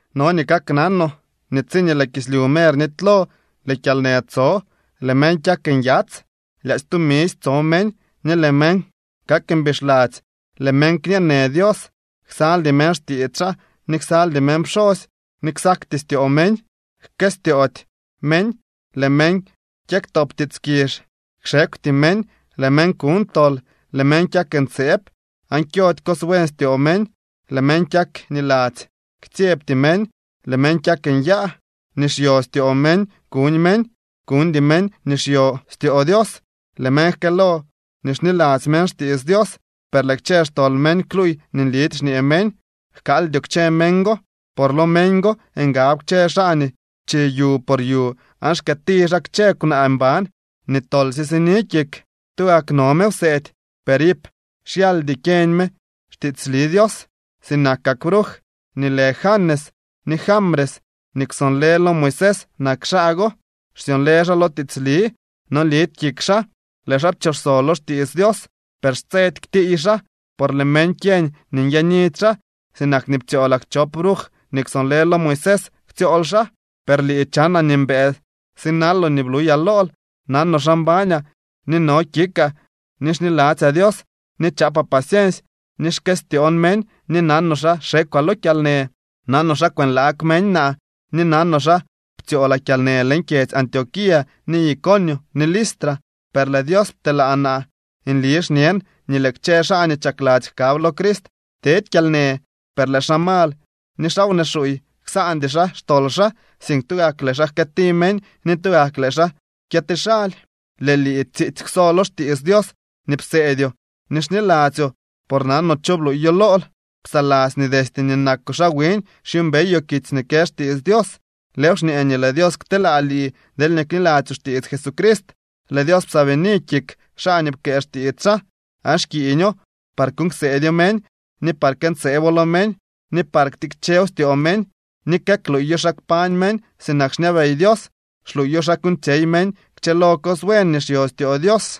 No nii kaknanoo nii tsiñee lëë kislyu mer nitylo lëë kyalnë tso. Lëë meñ kyak nyats, lyaadzy tumisy tso meñ, ni lëë meñ kak mbixladzy. Lëë meñ kñee në Dios, ksaldy meñ xtiits xaa ni ksaldy meñ pxosy ni ksakty styoo meñ. Jkëstyoody meñ, lëë meñ kyëktop tiits kizh, kxekwty meñ, lëë meñ kuñ tol, lëë meñ kyak ntseeb aan kyody cos buen styoo meñ. Lëë meñ kyak niladzy, ktsyebty meñ, lëë meñ kyak nyaa. Nii xyo styoo meñ kuñ meñ, kuñdy meñ nii xyo styoo Dios. Lëë meñ jkëëlo nii xniladzy meñ xtiits Dios, per lëë kchë xtol meñ kluuy nii nlidy xñee meñ. Jkaaldyoo kchë meñ go. Por lo meñ go ngab kchë xaa nii chi yu por yu aan xkëëti xaa kchë kwnaa mban nii tolsye sini kik. Tugak no me wseedy, per iip xyaldy kyeñ me xtiitsli Dios. Sinakak bruj nii lë Janes ni Jambres nii kwsonlë lo Moisés nak xaa go, xsyonlë xaa lo tiitsli. No lidy kik xaa, lëë xaa pchooxso lo xtiits Dios. Per xtsedy ktiiy xaa, por lëë meñ kyeñ nii nyaanidy xaa, sinak nii ptsyoolak chop bruj nii kwsonlë lo Moisés ktsyool xaa. Per lii chanaa nii mbëë sinaloo nii bluyaa lool, nanoo xa mbañaa, nii no kikaa, ni xniladzyaa Dios, ni chaapaa paciensy, ni xkëstyoon meñ, ni nanoo xa xekwaa lo kyalnë. Nanoo xa kwënlaag meñ naa, ni nanoo xa ptsyoolaa kyalnë leñ kyedzy Antioquía, ni Iconio ni Listra. Per lëë Dios pteelaa naa. Nli xñen nii lëë kchë xaa nii chakladzy jkab lo Crist tedy kyalnë. Per lëë xaa mal ni xaa wnee xuuy, ksaandy xaa xtol xaa, sink tugak lëë xaa jkëëti meñ ni tugak lëë xaa kyëti xaly. Lëë lii tsiitsy kwso lo xtiits Dios nii pseedyoo ni xniladzyoo por nanoo cho bluuyo lool. Psaladzy nii destye nii nakoo xaa wiñ xyuumbeyoo kitsy nii kë xtiits Dios. Lëëw xñee nii lëë Dios kteelaa lii deelñee kniladzyoo xtiits Jesucrist. Lëë Dios psaabini kik xaa nii pkëë xtiits xaa, aan xkiiño par kuuñ kseedyoo meñ, ni par këntseebo lo meñ, ni par ktikchew styoo meñ ni këkluuyo xa kpañ meñ sinak xñabey Dios. Xluuyo xa kuuñtsyey meñ kchëlo cos buen nii xyo styoo Dios.